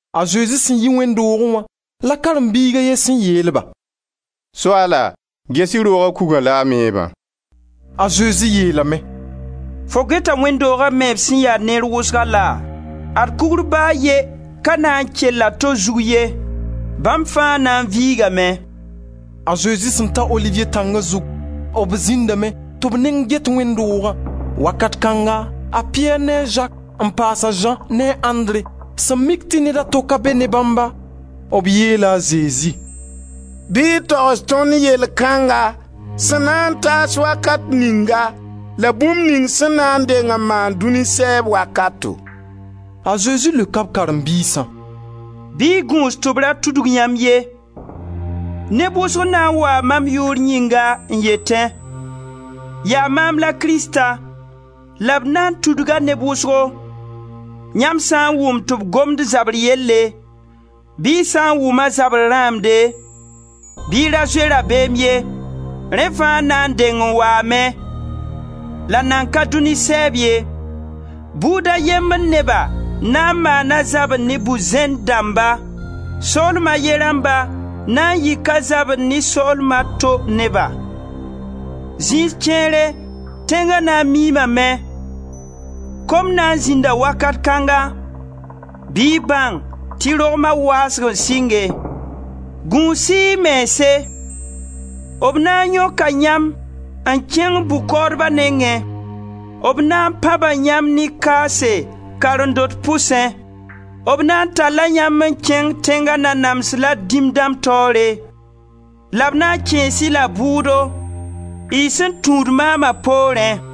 A Zezi sẽn yi wẽnd doogẽ wã la karen-biig a ye sẽn yeel-ba: «Soaala, ges-y rooga kugã la a meebã.» A Zezi yeel-a lame: «Fo geta wẽnd dooga meeb sẽn ya neer wʋsga laa? Ad kugr ba a ye ka na n kell a to zug ye, bãmb fãa na n viigame!» A Zezi sẽn ta Oliviye Tĩngla zugu, b zĩndame tɩ b neng get wẽnd doogã. Wakat kãnga a Piyɛr ne a Zak n paas a Zã ne a Andre sẽn mik tɩ ned a to ka be ne bãmba, b yeela a Zezi: «Bɩ y togs tõnd yell kãnga sẽn na n taas wakat ninga la bũmb ning sẽn na deng n maan dũni sɛɛb wakato.» A Zezi leoka b karen-biisã: «Bɩ y gũus tɩ b ra tudg yãmb ye. Neb wʋsg na n waa mam yʋʋr yĩnga n yetẽ: ‹Yaa maam la Krista,› la b na tudga neb wʋsgo. Yãmb sã n wʋm tɩ b gomd zabr yelle, bɩ y sã n wʋma zabr rãamde, bɩ y ra zoe rabeem ye. Rẽ fãa na n deng waame la nan ka dũni sɛɛb ye. Buud a yembr neba na n maana zabre ne bu-zẽnd dãmba, soolem a ye rãmba na n yika zabr ne soolm a to neba. Zĩis kẽere tẽnga na miimame; kom na n zĩnda wakat kãnga, bɩ y bãng tɩ rogma waasg n sɩnge. Gũus-y y mense. B na yõka yãmb n kẽng bʋ-kaoodba nengẽ; b na n pãba yãmb ne kaase karen-dot pʋsẽ; b na n talla yãmb n kẽng tẽnga nanams la dĩm dãmb taoore, la b na n kẽes-y la bʋʋdo, y sẽn tũud maama poorẽ.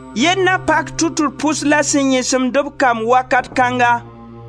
Yell na pak tʋtr-pʋs la sẽn yẽsemd-b kamb wakat kãnga.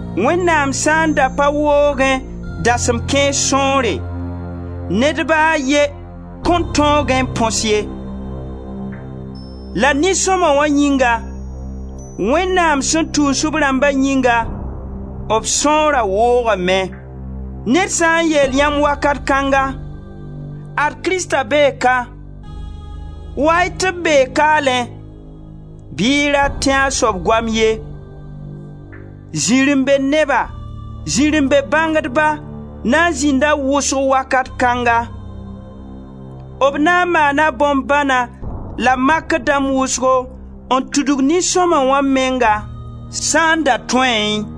Wẽnnaam sã n da pa woogẽ dasem kãens sõore, ned ba a ye kõn tõogẽ n põs ye. La nin-sõma yĩnga, Wẽnnaam sẽn tũus b rãmba yĩnga, b sõora woogame. Ned sã n yeel yãmb wakat kãnga: ‹Ad Krista bee ka; wa-y tɩ b bee kaalẽ,› bɩ y ra tẽ a soab goam ye. Zirẽ-be-neba, zirẽ-be-bãngdba na n zĩnda wʋsg wakat kãnga. B na n maana bõn-bãna la makr dãmb wʋsgo n tudg nin-sõma wã menga sã n da tõeẽ.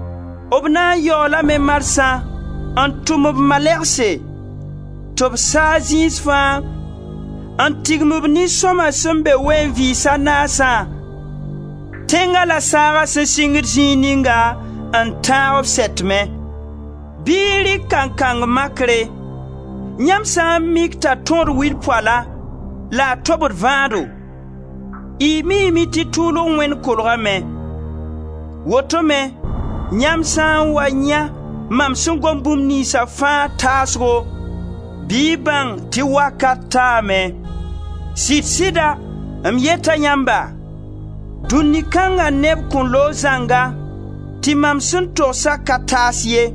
B na n yaoolame marsã n tʋm b malɛgse tɩ b saag zĩis fãa n tigim b nin-sõma sẽn be ween-vɩɩs a naasã, tẽnga la saaga sẽn singd zĩig ninga n tãag b sɛtmẽ. Bɩ y rɩk kankang makre. Yãmb sã n mik t'a tãood wil poala la a tobd vãado, y miime tɩ tʋʋlg wẽnd kolgame. Woto-me yãmb sã n wa yãe mam sẽn gom bũmb niynsa fãa taasgo, bɩ y bãng tɩ wakat taame. Sɩd-sɩda m yeta yãmba: dũni kãnga neb kõn loog zãnga tɩ mam sẽn togsa ka taas ye.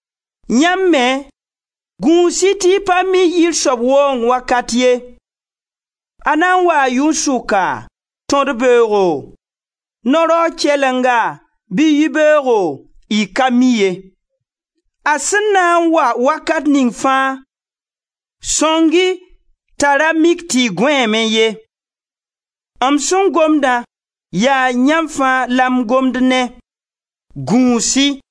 Yãmb me, gũus-y tɩ y pa mi yir soab waoong wakat ye. A na n waa yʋn-sʋka, tõd-beoogo, no-raoog kɛlenga, bɩ yibeoogo, y ka mi ye. A sẽn na n wa wakat ning fãa, sõng-y t'a ra mik tɩ y gõeeme ye. M sẽn gomdã yaa yãmb fãa la m gomd ne: gũus-y.»